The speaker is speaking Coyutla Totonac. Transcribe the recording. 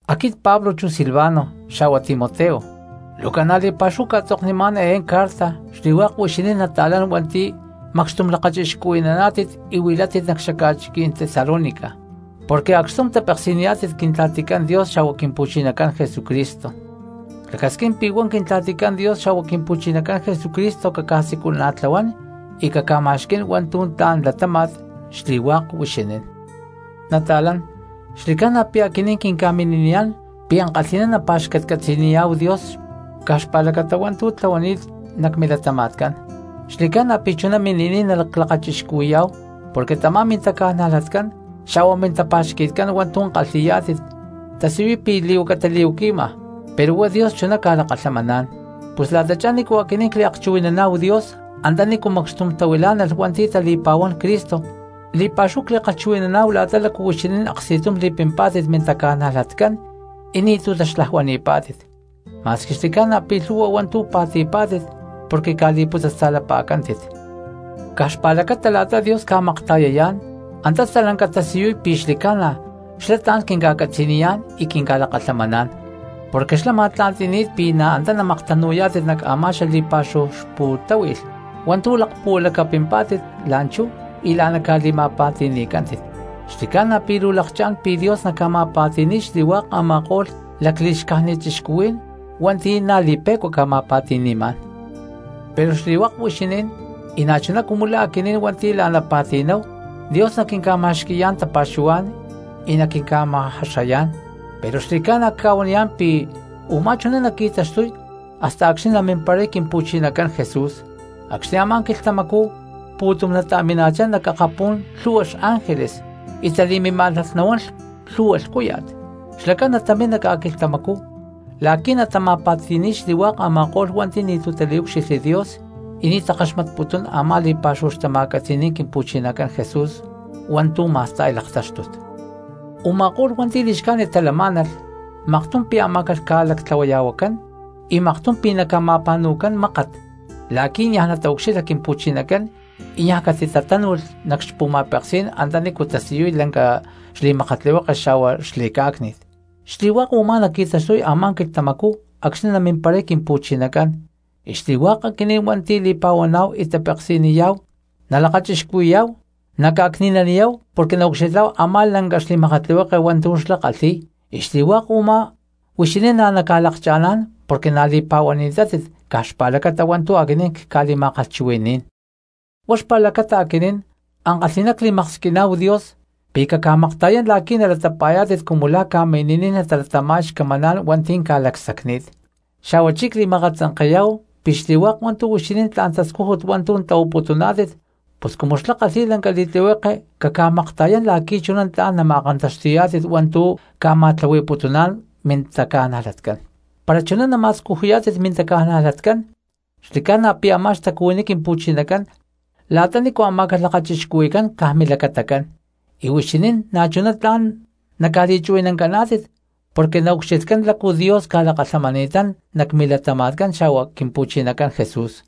Aquit Pablo chu Silvano xa̠hua Timoteo, luu ca̠na li̠pa̠xúhu cca̠tzoknimá̠n eé carta xli̠hua̠k huixinín nata̠lán hua̠nti̠ macxtum lakachixcuhui̠naná̠tit y huilátit nac xaca̠chiquí̠n Tesalónica porque acxtum tapeksi̠niyá̠tit Quintla̠ticán Dios xa̠hua Quimpu̠chinacán Jesucristo. Clacasquín pi̠ huá Quintla̠ticán Dios xa̠hua Quimpu̠chinacán Jesucristo caca̠siculana̠tlahuán y caca̠ma̠xquí̠n hua̠ntu̠ tla̠n latáma̠t xli̠hua̠k huixinín. Nata̠lán, xli̠ca̠na pi̠ aquinín quinca̠mini̠niyá̠n pi̠ ankalhi̠ná nacpa̠xcatcatzi̠niyá̠hu Dios caj xpa̠lacata hua̠ntu̠ tlahuani̠t nac milatama̠tcán, xli̠ca̠na pi̠ chuná mini̠niy naclakachixcuhui̠yá̠hu porque tamá mintaca̠najlatcán xa̠hua mintapa̠xqui̠tcán hua̠ntu̠ la̠kalhi̠niyá̠tit tasiyuy pi̠ li̠huaca tali̠huaqui̠ma pero huá Dios chuná ca̠lakalhamaná̠n. Pus la̠tachá nícu aquinín cliakchuhui̠naná̠hu Dios antanícu macxtum tahuilá̠nalh hua̠nti̠ tali̠pa̠huán Cristo, li̠pa̠xúhu cli̠kalhchuhui̠naná̠hu la̠ta lácu huixinín aksti̠tum li̠pimpá̠tit mintaca̠najlatcán y ni̠tu̠ taxlajuani̠pá̠tit, ma̠squi xli̠ca̠na pi̠ lhu̠hua hua̠ntu̠ pa̠ti̠pá̠tit porque ca̠li̠putzasta̠lapa̠cántit. Caj xpa̠lacata la̠ta Dios ca̠makta̠yayá̠n antá stalanca tasiyuy pi̠ xli̠ca̠na xlá tla̠n quinca̠catzaniyá̠n y quinca̠lakalhamaná̠n, porque xlá ma̠tla̠nti̠ni̠t pi̠ na̠ antá namaktanu̠yá̠tit nac xaca̠li̠pa̠xúhu xpu̠táhui̠lh hua̠ntu̠ lakpuhualacapimpá̠tit la̠nchú y la̠ná ca̠li̠ma̠pa̠ti̠ni̠pa̠cántit. Xli̠ca̠na pi̠ luu lakchá̠n pi̠ Dios naca̠ma̠pa̠ti̠ni̠y xli̠hua̠k a̠ma̠ko̠lh lacli̠xcájnit cristianos hua̠nti̠ na̠ li̠pe̠cua ca̠ma̠pa̠ti̠ni̠má̠n. Pero xli̠hua̠k huixinín y na̠chuná cumu la̠ aquinín hua̠nti̠ la̠ná pa̠ti̠namá̠hu, Dios naquinca̠ma̠xqui̠yá̠n tapa̠xuhuá̠n y naquinca̠ma̠jaxayá̠n. Pero xli̠ca̠na cca̠huaniyá̠n pi̠ u̠má chuná naqui̠taxtuy hasta acxni̠ namimparay Quimpu̠chinacán Jesús, acxni̠ a̠má quilhtamacú pu̠tum natamina̠chá nac akapú̠n lhu̠hua xángeles y tali̠mimá̠nalh nahuán lhu̠hua lhcúya̠t. Xlacán natamín nac ca̠quilhtamacú la̠qui̠ natama̠pa̠ti̠ni̠y xli̠hua̠k a̠ma̠ko̠lh hua̠nti̠ ni̠tu̠ taliucxilha Dios y ni̠ takaxmatputún a̠má li̠pa̠xúhu xtama̠catzi̠ní̠n Quimpu̠chinacán Jesús hua̠ntu̠ ma̠sta̠y laktáxtut. Uma̠kó̠lh hua̠nti̠ li̠xcájnit talamá̠nalh maktum pi̠ amá̠calh ca̠lactlahuaya̠huacán y maktum pi̠ naca̠ma̠pa̠nu̠cán mákat la̠qui̠ niaj nataucxilha Quimpu̠chinacán y niaj catitatánu̠lh nac xpu̠ma̠peksí̠n antanícu tasiyuy lanca xli̠makatlihueke xa̠hua xli̠cá̠cni̠t. Xli̠hua̠k u̠má naqui̠taxtuy a̠má quilhtamacú acxni̠ namimparay Quimpu̠chinacán y xli̠hua̠k aquinín hua̠nti̠ li̠pa̠huaná̠hu y tapeksi̠niyá̠hu nalakachixcuhui̠yá̠hu naca̠cni̠naniyá̠hu porque naucxilhá̠hu a̠má lanca xli̠makatlihueke hua̠ntu̠ xlá kalhi̠y. Y xli̠hua̠k u̠má huixinín na̠ naca̠lakcha̠ná̠n porque na̠ li̠pa̠huani̠tátit caj xpa̠lacata hua̠ntu̠ aquinín cca̠li̠ma̠kalhchuhui̠ni̠nán. Huá xpa̠lacata aquinín ankalhi̠ná cli̠maksquiná̠hu Dios pi̠ caca̠makta̠yán la̠qui̠ nalatapa̠yá̠tit cumu la̠ ca̠mini̠niy talatama̠y xcamaná̠n hua̠nti̠ ca̠lacsacni̠t, xa̠huachí cli̠ma̠katzanke̠yá̠hu pi̠ xli̠hua̠k hua̠ntu̠ huixinín tla̠n tascújut hua̠ntu̠ tlahuaputuná̠tit pus cumu xlá kalhi̠y lanca li̠tlihueke caca̠makta̠yán la̠qui̠ chuná tla̠n nama̠kantaxti̠yá̠tit hua̠ntu̠ ca̠ma̠tlahui̠putuná̠n mintaca̠najlatcán. Para chuná nama̠scujuyá̠tit mintaca̠najlatcán xli̠ca̠na pi̠ a̠má xtacuhuiní Quimpu̠chinacán la̠ta nícu amá̠calh lakachixcuhui̠cán caj milacatacán, y huixinín na̠chuná tla̠n naca̠li̠chuhui̠nancaná̠tit porque naucxilhcán lácu Dios ca̠lakalhamani̠tán nac milatama̠tcán xa̠hua Quimpu̠chinacán Jesús.